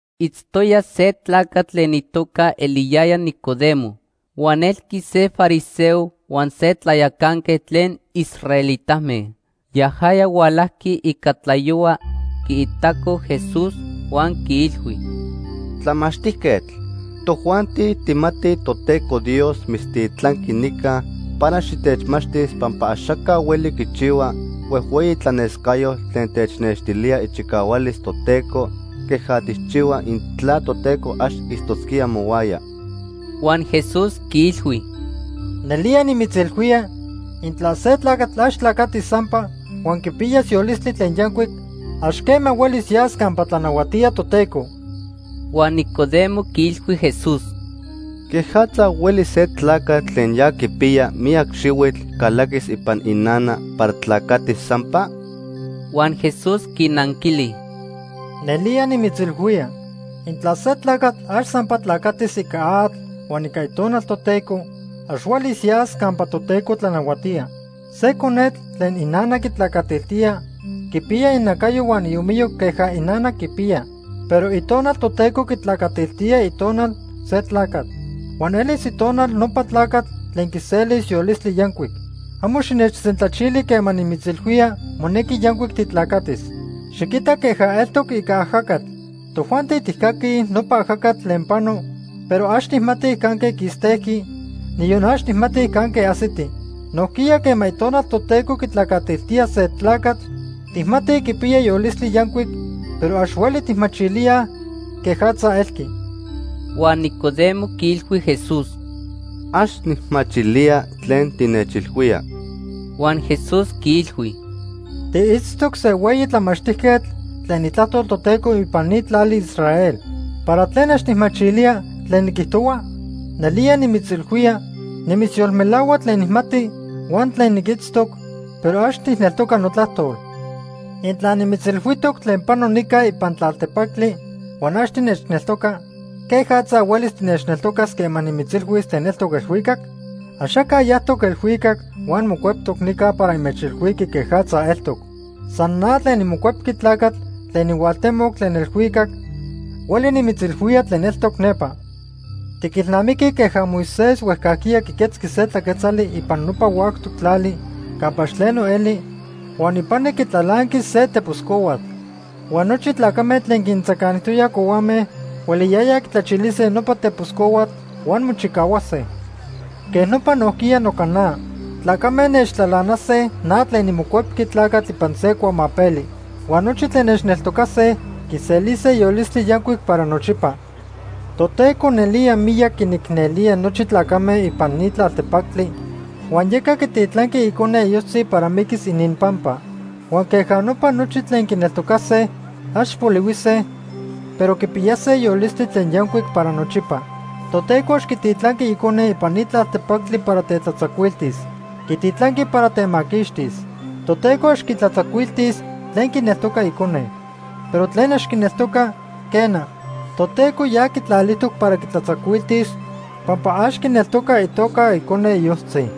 Itztoya se tlacatl tlen itoca eliyaya Nicodemo huan elqui se fariseo huan se tlayacanquetl tlen israelitame. Yajaya hualajqui ica tlayohua quiitaco Jesús huan quiilhui: ―Tlamachtijquetl, tojuanti tijmatij Toteco Dios mitztitlanqui nica para xitechmachtis pampa axaca hueli quichihua huejhueyi tlanescayotl tlen technextilía ichicahualis Toteco queja tijchihua intla Toteco ax itztosquía mohuaya. Huan Jesús quiilhui: ―Nelía nimitzilhuía, intla se tlacatl ax tlacatis sampa huan quipiyas yolistli tlen yancuic, ax quema huelis yas campa tlanahuatía Toteco. Huan Nicodemo quiilhui Jesús: ―¿Quejatza hueli se tlacatl tlen ya quipiya miyac xihuitl calaquis ipan inana para tlacatis sampa? Huan Jesús quinanquili: ―Nelía nimitzilhuía, intla se tlacatl ax sampa tlacatis ica atl huan ica Itonal Toteco, ax huelis yas campa Toteco tlanahuatía. Se conetl tlen inana quitlacatiltía quipiya inacayo huan iomiyo queja inana quipiya. Pero Itonal Toteco quitlacatiltía itonal se tlacatl. Huan elis itonal nopa tlacatl tlen quiselis yolistli yancuic. Amo xinechsentlachili quema nimitzilhuía monequi yancuic titlacatis. Xiquita queja eltoc ica ajacatl. Tojuanti tijcaquij nopa ajacatl tlen pano, pero ax tijmatij canque quistejqui, niyon ax tijmatij canque ajsiti. Nojquiya quema Itonal Toteco quitlacatiltía se tlacatl, tijmatij quipiya yolistli yancuic, pero ax hueli tijmachilíaj quejatza elqui. Huan Nicodemo quiilhui Jesús: ―Ax nijmachilía tlen tinechilhuía. Huan Jesús quiilhui: ―Tiitztoc se hueyi tlamachtijquetl tlen Itlajtol Toteco ipan ni tlali Israel. ¿Para tlen ax tijmachilía tlen niquijtohua? Nelía nimitzilhuía, nimitzyolmelahua tlen nijmati huan tlen niquitztoc, pero ax tijneltoca notlajtol. Intla nimitzilhuijtoc tlen pano nica ipan tlaltepactli huan ax tinechneltoca, ¿quejatza huelis tinechneltocas quema nimitzilhuis tlen eltoc elhuicac? “Axaca yajtoc elhuicac huan mocueptoc nica para inmechilhuiqui quejatza eltoc. San na tlen niMocuepqui Tlacatl tlen nihualtemoc tlen elhuicac hueli nimitzilhuía tlen eltoc nepa. Tiquilnamiquij queja Moisés huejcajquiya quiquetzqui se tlaquetzali ipan nopa huactoc tlali campa ax tleno eli huan ipani quitlalanqui se tepos cohuatl. Huan nochi tlacame tlen quintzacanijtoyaj cohuame hueliyayaj quitlachilise nopa tepos cohuatl huan mochicahuase. Quej nopa nojquiya noca na. Tlacame nechtlalanase na tlen niMocuepqui Tlacatl ipan se cuamapeli. Huan nochi tlen nechneltocase quiselise yolistli yancuic para nochipa.” Toteco nelía miyac quinicnelía nochi tlacame ipan ni tlaltepactli huan yeca quititlanqui Icone iyojtzi para miquis ininpampa. Huan queja nopa nochi tlen quineltocase, ax polihuise, pero quipiyase yolistli tlen yancuic para nochipa. Toteco ax quititlanqui Icone ipan ni tlaltepactli para tetlatzacuiltis. Quititlanqui para temaquixtis. Toteco ax quitlatzacuiltis tlen quineltoca Icone. Pero tlen ax quineltoca, quena, Toteco ya quitlalijtoc para quitlatzacuiltis pampa ax quineltoca itoca Icone iyojtzi.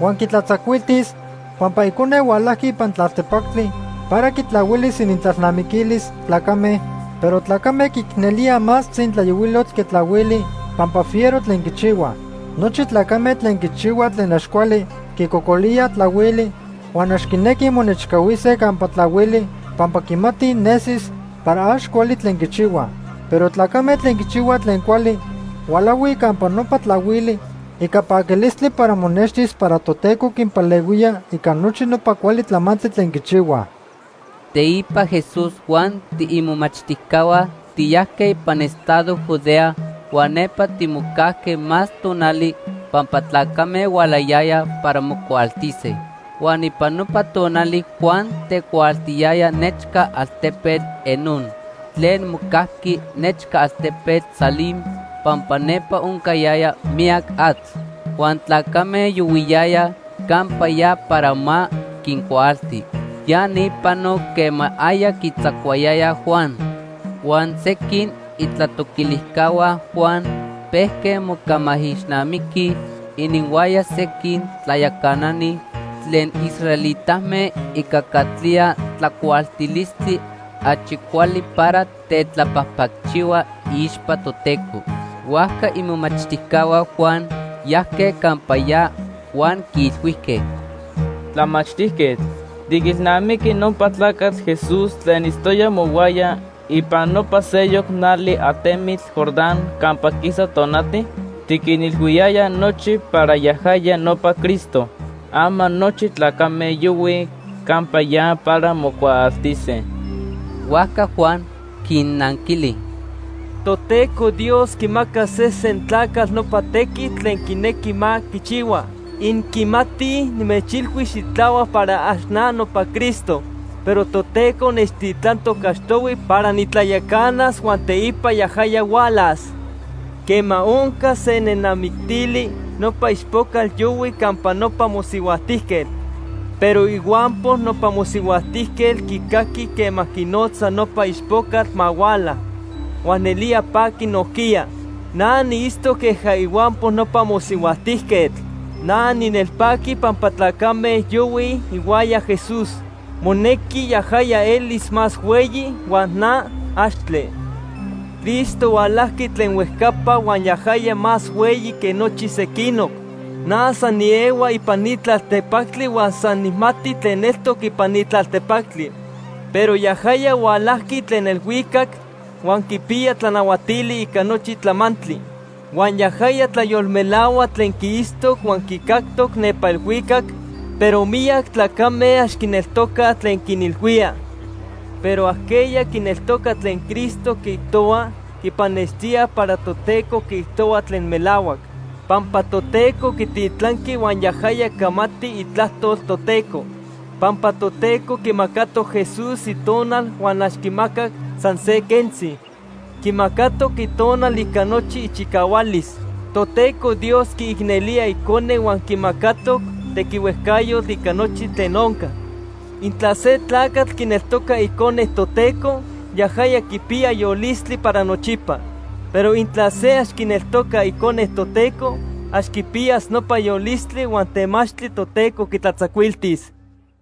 Huan quitlatzacuiltis pampa Icone hualajqui ipan tlaltepactli para quitlahuilis inintlalnamiquilis tlacame, pero tlacame quiicnelíaj más tzintlayohuilotl que tlahuili pampa fiero tlen quichihuaj. Nochi tlacame tlen quichihuaj tlen ax cuali quicocolíaj tlahuili huan ax quinequij monechcahuise campa tlahuili pampa quimatij nesis para ax cuali tlen quichihuaj. Pero tlacame tlen quichihuaj tlen cuali hualahui campa nopa tlahuili ica paquilistli para monextis para Toteco quinpalehuía ica nochi nopa cuali tlamantli tlen quichihuaj. Teipa Jesús huan tiimomachtijcahua tiyajque ipan estado Judea huan nepa timocajque más tonali pampa tlacame hualayayaj para mocuaaltise. Huan ipan nopa tonali Juan tecuaaltiyaya nechca altepetl Enón tlen mocajqui nechca altepetl Salim pampa nepa oncayaya miyac atl. Huan tlacame yohuiyayaj campa ya para ma quincuaalti. Ya ni panoc quema aya quitzacuayayaj Juan. Huan sequin itlatoquilijcahua Juan pejque mocamaijixnamiquij ininhuaya sequin tlayacanani tlen israelitame ica catlía tlacuaaltilistli achi cuali para tetlapajpacchihua iixpa Toteco. Huajca imomachtijcahua Juan yajque campa ya huan quiilhuijque: ―Tlamachtijquetl, ¿tiquilnamiqui nopa tlacatl Jesús tlen itztoya mohuaya ipan nopa seyoc nali atemitl Jordán campa quisa tonati? Tiquinilhuiyaya nochi para yajaya nopa Cristo. Ama nochi tlacame yohuij campa ya para mocuaaltise. Huajca Juan quinnanquili: ―Toteco Dios quimaca sesen tlacatl nopa tequitl tlen quinequi ma quichihua. Inquimatij nimechilhui xitlahuac para ax na nopa Cristo, pero Toteco nechtitlantoc achtohui para nitlayacanas huan teipa yajaya hualas. Quema onca se nenamictili, nopa ichpocatl yohui campa nopa mosihuajtijquetl, pero ihuampo nopa mosihuajtijquetl quicaqui quema quinotza nopa ichpocatl ma huala, huan nelía paqui nojquiya. Na niitztoc queja ihuampo nopa mosihuajtijquetl. Na ninelpaqui pampa tlacame yohuij ihuaya Jesús. Monequi yajaya elis más hueyi huan na, axtle. “Cristo hualajqui tlen huejcapa huan yajaya más hueyi que nochi sequinoc. Na san niehua ipan ni tlaltepactli huan san nijmati tlen eltoc ipan ni tlaltepactli. Pero yajaya hualajqui tlen elhuicac huan quipiya tlanahuatili ica nochi tlamantli. Huan yajaya tlayolmelahua tlen quiitztoc huan quicactoc nepa elhuicac, pero miyac tlacame ax quineltocaj tlen quinilhuía. Pero ajqueya quineltoca tlen Cristo quiijtohua, quipannextía para Toteco quiijtohua tlen melahuac. Pampa Toteco quititlanqui huan yajaya camati itlajtol Toteco. Pampa Toteco quimacatoc Jesús Itonal huan ax quimacac san se quentzi. Quimacatoc Itonal ica nochi ichicahualis. Toteco Dios quiicnelía Icone huan quimacatoc tequihuejcayotl ica nochi tlen onca. Intla se tlacatl quineltoca Icone Toteco, yajaya quipiya yolistli para nochipa. Pero intla se ax quineltoca Icone Toteco, ax quipiyas nopa yolistli huan temachtli Toteco quitlatzacuiltis.”